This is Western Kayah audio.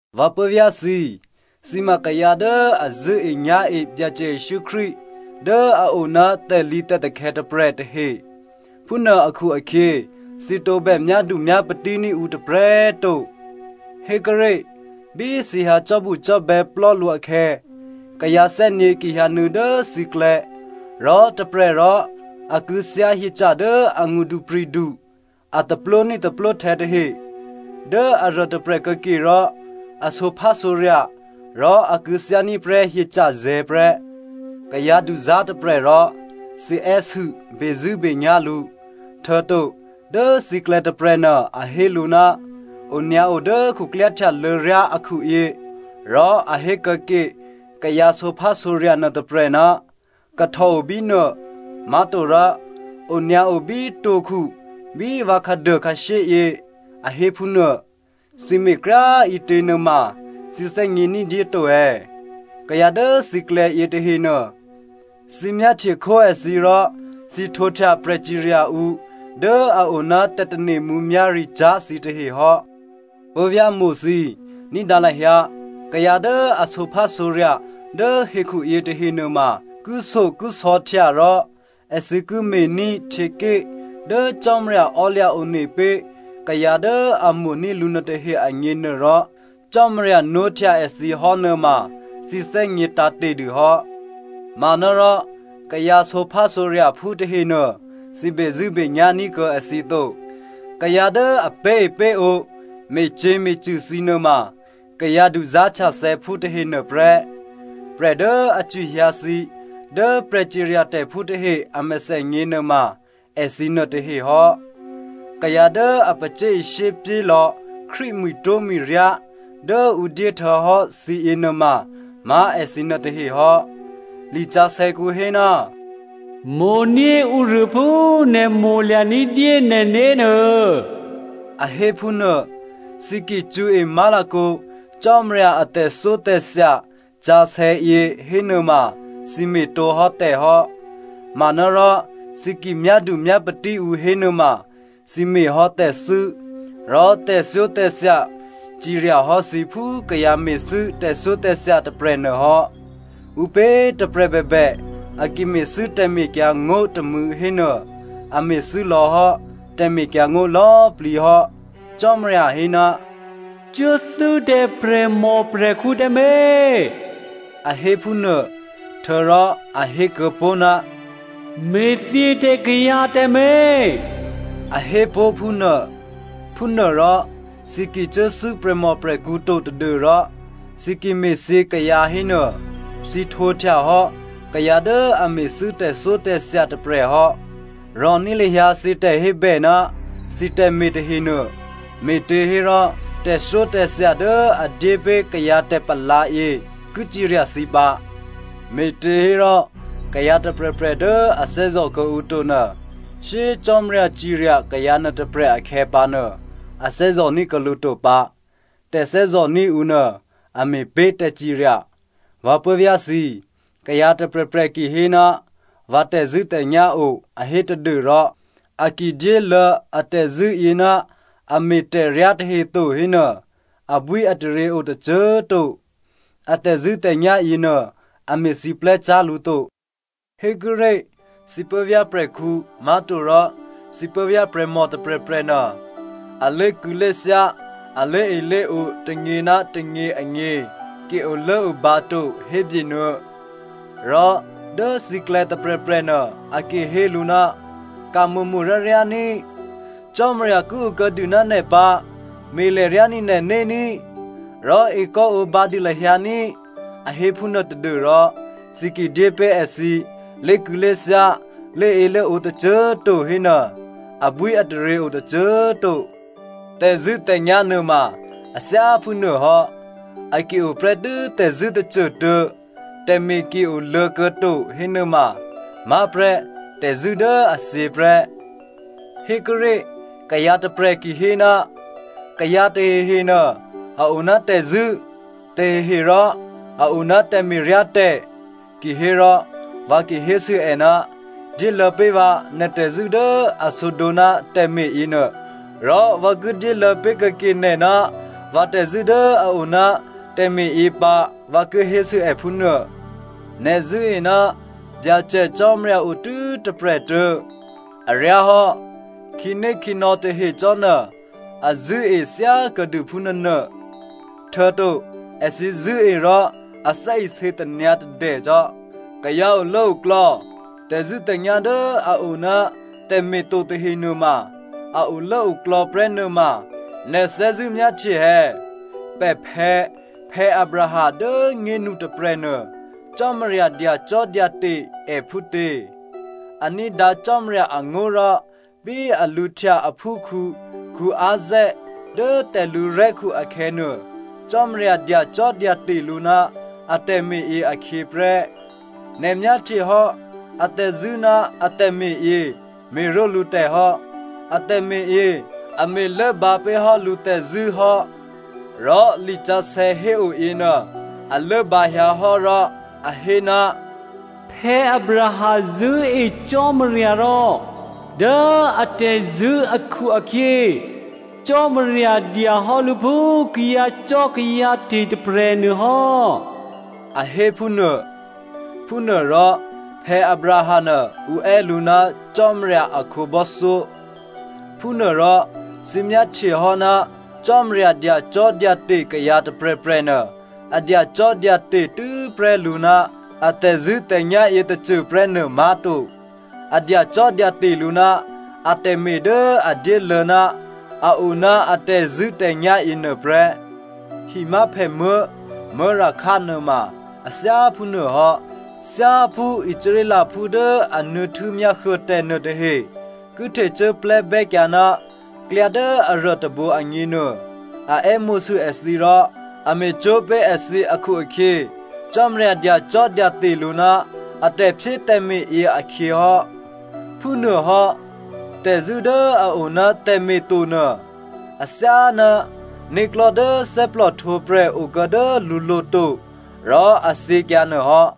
Vǎ puố̤vyá̤ thǐ꤮, thǐ ma kayǎ dố a zṳ̂́enyá̤e Byacè Jesǔ Krístu dố a o ná tè̤lǐtè̤takhè̌ tôprè̤ tahe. Phúnuô akhu-akhyě, thǐ tǒbè myádu myápatí ní̤ ǔ tôprè̤꤮ to. Hékuốré̤ bí thǐ hyǎ cò́bucò́bè̌ plò́ lǔ akhè̌, kayǎ thè́nyě̤ ki hyǎnuô̌ dố thǐklè̌, rò tôprè̤ rò a kû̌thyá hyeca̤ dố angṳdupri̤du, a taplwóní̤ taplwóhtè̌ tahe, dố aruô tôprè̤ kuô̌ke rò, a sǒphásǒrya̤ rò a kû̌thyá ní̤ prè́ hyeca̤zè̤̌ prè́. Kayǎ duzá̤ tôprè̤ rò thǐ è́sû bezṳ̂́benyá̤ lǔ, htuô̌to dố thǐklè̌ tôprè̤nuô a hé lǔ, “Onyǎo dố khuklyáhtyalô̌ ryá akhuyě” rò a hé kuô̌ke kayǎ sǒphásǒrya̤ nuôtôprè̤, “Kahtò obínuô,” má̤torò “Onyǎo bí two̤khu bí vǎ khǎduô khǎshyéyě,” a hé phúnuô. Thǐ me̤kryá꤮ ǐtě nuôma thǐ thè́gně ní̤dyé to è̌? Kayǎ dố thǐklè̌ yětahenuô, thǐ myáhtye khó èthǐ rò thǐ htwǒhtya prè̤cirya ǔ dố a oná tè̤tane̤ mǔmyá̤ricyá̤ thǐtahe hò́. Puố̤vyá̤mo̤ thǐ꤮, ní̤dǎ lahyǎ. Kayǎ dố a sǒphásǒrya̤ dố hekhu yětahe nuôma, thyáphú èthǐ tè̤zṳ̂́tè̤nyá̤ kishyokisò̌htya rò èthǐ ki me̤ní̤ htyěké̤ dố Cò́marya ò́lya̤ one pé̤ kayǎ dố a mo̤ní̤ lǔ nuôtahe agněnuôrò, Cò́marya nwóhtya èthǐ hò́ nuôma thǐ thè́gně tǎ̤te̤ dû hò́. Manárò kayǎ sǒphásǒrya̤phú tahenuô thǐ bezṳ̂́benyá̤ ní̤ kuô̌ èthǐ to. Kayǎ dố a pé̤epé̤ǒ me̤cyě̤me̤cṳ̂ thǐ nuôma kayǎ duzá̤htyathè̌phú tahenuô prè́. Prè̤ dố a cwihyǎ thǐ dố prè̤ciryatè̤phú tahe a mèthènyě nuôma èthǐ nuôtahe hò́. Kayǎ dố a pacyé̤ishyé pyélò̌ Krístu mwi̤twó̤mwi̤ryá dố ǔ dyé htuô̌hò́ thǐ yěnuôma má̤ èthǐ nuôtahe hò́. Lisǎsè̌kǔ hé, “Mo̤ní̤ ǔruô phú nè̤ mo̤lya̤ ní̤dyé nè̤né̤ nuô,” a hé phúnuô. Thǐ ki cṳ̌e má̤lakǒ Cò́marya ahtyěké̤ atè̤thyótè̤thya yě hénuôma thǐ me̤tǒhò́ tè̤ hò́. Manárò thǐ ki myádu myápatí ǔ hénuôma, thǐ me̤hò́ tè̤thû́ rò tè̤thyótè̤thya cirya hò́ thǐ phú kayǎ me̤thû́ tè̤thyótè̤thya tôprè̤nuô hò́. Ǔpě꤮ tôprè̤ bèbè a ki me̤thû́ tè̤mekyǎngó̤ tômû̌ hénuô, a me̤thû́ lò̌hò́ tè̤mekyǎngó̤ lò̌꤮ plǐ hò́. Cò́marya hé, “Cuốthû́ tǎ prè̤mòprè̤khǔ tǎmé̤” a hé phúnuô. Htuô̌rò a hékuô̌ pó̤, “Me̤thyě tǎ kayǎ tǎmé̤” a hé pó̤ phúnuô. Phúnuôrò thǐ ki cuốthû́ prè̤mòprè̤khǔ to tadû́rò thǐ ki me̤thyě kayǎ hénuô, thǐ htwǒhtya hò́ kayǎ dố a me̤thû́ tè̤thyótè̤thya tôprè̤ hò́. Rò̤ní̤ lahyǎ thǐ tè̤hébè ná thǐ tè̤me̤ tahenuô. Me̤těhérò tè̤thyótè̤thya dố a dyé pé̤ kayǎ tè̤palǎ yě ki cirya thǐ pǎ. Me̤těhérò kayǎ tôprè̤prè̤ dố a thè́zò̤ kuô̌ǔ to nuô, shyé꤮ Cò́marya cirya kayǎ nuôtôprè̤ akhè̌pǎnuô, a thè́zò̤ ní̤kuô̌ lǔ to pǎ. Tè̤thè́zò̤ní̤ ǔ nuô a me̤pé̤ tè̤cirya. Vǎ puố̤vyá̤ thǐ꤮, kayǎ tôprè̤prè̤ ki hé ná vǎ tè̤zṳ̂́tè̤nyá̤ o a hé tadû́rò a ki dyéluô̌ a tè̤zṳ̂́yě ná a me̤ tè̤ryá tahe to hénuô, abwíataryě o tôcô꤮ to. A tè̤zṳ̂́tè̤nyá̤ yěnuô a me̤siplè́cyá̤ lǔ to. Hékuốré̤ thǐ puố̤vyá̤ prè̤khǔ má̤torò thǐ puố̤vyá̤ prè̤mò tôprè̤prè̤ nuô a lé̤kû̌lé̤thyá, a lé̤elé̤ǒ tônyě ná tônyě agně ki olốobǎ to hébyenuô, rò dố thǐklè̌ tôprè̤prè̤nuô a ki hé lǔ, “Ka̤mo̤mo̤ ka̤ryáryá ní꤮, Cò́marya ki okuô̌ dû ná nè̤ pǎ, me̤lè̤ryání̤ nè̤né̤ ní, rò ekò́ǒbǎ dû lahyǎ ní꤮,” a hé phúnuô tadû́rò thǐ ki dyépé̤ èthǐ lé̤kû̌lé̤thyá, lé̤elé̤ǒ tôcô꤮ to hénuô, abwíataryě o tôcô꤮ to. Tè̤zṳ̂́tè̤nyá̤ nuôma a thyáphú nuôhò́. A ki oprè́tû́ tè̤zṳ̂́ tôcôtuô̌, tè̤me̤ ki oluô̌ kuô̌to hénuôma má̤prè́ tè̤zṳ̂́ dố a thyě prè́. Hékuốré̤ kayǎ tôprè̤ ki hé, “Kayǎ tahehe nuô a o ná tè̤zṳ̂́, tahehe rò a o ná tè̤me̤ryá tè̤.” Ki hé rò vǎ ki hésû è, dyéluô̌ pé̤ vǎ nè̤ tè̤zṳ̂́ dố a sǒdǒ ná tè̤me̤ yěnuô, rò vǎ ki dyéluô̌ pé̤ kuô̌ke nè̤ ná vǎ tè̤zṳ̂́ dố a o ná tè̤me̤yě pǎ vǎ ki hésû è phúnuô. Nè̤ zṳ̂́e ná Byacè Cò́marya otû́ tôprè̤꤮ tuô̌. Aryáhò́. Khǐnékhǐnò̌ tahe cò́nuô a zṳ̂́e thyákuô̌dû phúnuônuô, htuô̌to èthǐ zṳ̂́e rò a thè́isě tanyǎ̤tadè cò́. Kayǎ olốoklò̌, tè̤zṳ̂́tè̤nyá̤ dố a o ná tè̤me̤ to tahe nuôma a olốoklò̌ prè́ nuôma, nè̤ thè́zṳ̂́ myáhtye è̌? Pè̤phè̌ Abraham dố꤮ nyénu tôprè̤nuô Cò́marya dyacò́dyate̤ è phútě? A ní̤dǎ Cò́marya angó̤ rò bí a lǔhtya aphúkhǔ Isaac dố tè̤lǔrè̤́khu akhè̌nuô, Cò́marya dyacò́dyate̤ lǔ ná a tè̤me̤yě akhyě prè́. Nè̤ myáhtye hò́ atè̤zṳ̂́ ná a tè̤me̤yě me̤ró̤lǔ tè̤hò́. A tè̤me̤yě a me̤ lốbǎ pé̤hò́ lǔ tè̤zṳ̂́ hò́. Rò lisǎsè̌ héo yěnuô a lốbǎhyǎ hò́ rò a hé, “Abraham zṳ̂́e Cò́marya rò dố atè̤zṳ̂́ akhu-akhyě, Cò́marya dyahò́ lǔ phú kayǎcò́kayǎte̤ tôprè̤ nuôhò́,” a hé phúnuô. Phúnuôrò Abraham nuô ǔ è́ lǔ ná Cò́marya a khǒbò́thyó. Phúnuôrò, thǐ myáhtyehò́ ná Cò́marya dyacò́dyate̤ kayǎ tôprè̤prè̤nuô, a dyacò́dyate̤ tû́prè́ lǔ ná a tè̤zṳ̂́tè̤nyá̤ yětôcô prè́ nuô má̤to. A dyacò́dyate̤ lǔ ná atè̤me̤ dố a dyéluô̌ ná a o ná a tè̤zṳ̂́tè̤nyá̤ yěnuô prè́. Himyáphèmuố̤ Rahab nuôma a thyáphúnuô hò́. Thyáphú Israelphú dố a nuô̌ htû́myá huô tè̤ nuôtahe ki htecuốsiplè́ bè́kyǎ ná klyá dố aruô tôbǒ agněnuô, a è́mo̤sû èthǐ rò a me̤cwó̤ pé̤ èthǐ akhu-akhyě Cò́marya dyacò́dyate̤ lǔ ná a tè̤phyétè̤me̤ yěakhyěhò́. Phúnuôhò́, tè̤zṳ̂́ dố a o ná tè̤me̤ tonuô, athyáná né̤klò̤́ dố thè́plòhtwǒprè̤ o kuô̌ dố lǔlo̤ to rò a thyěkyǎ nuô hò́.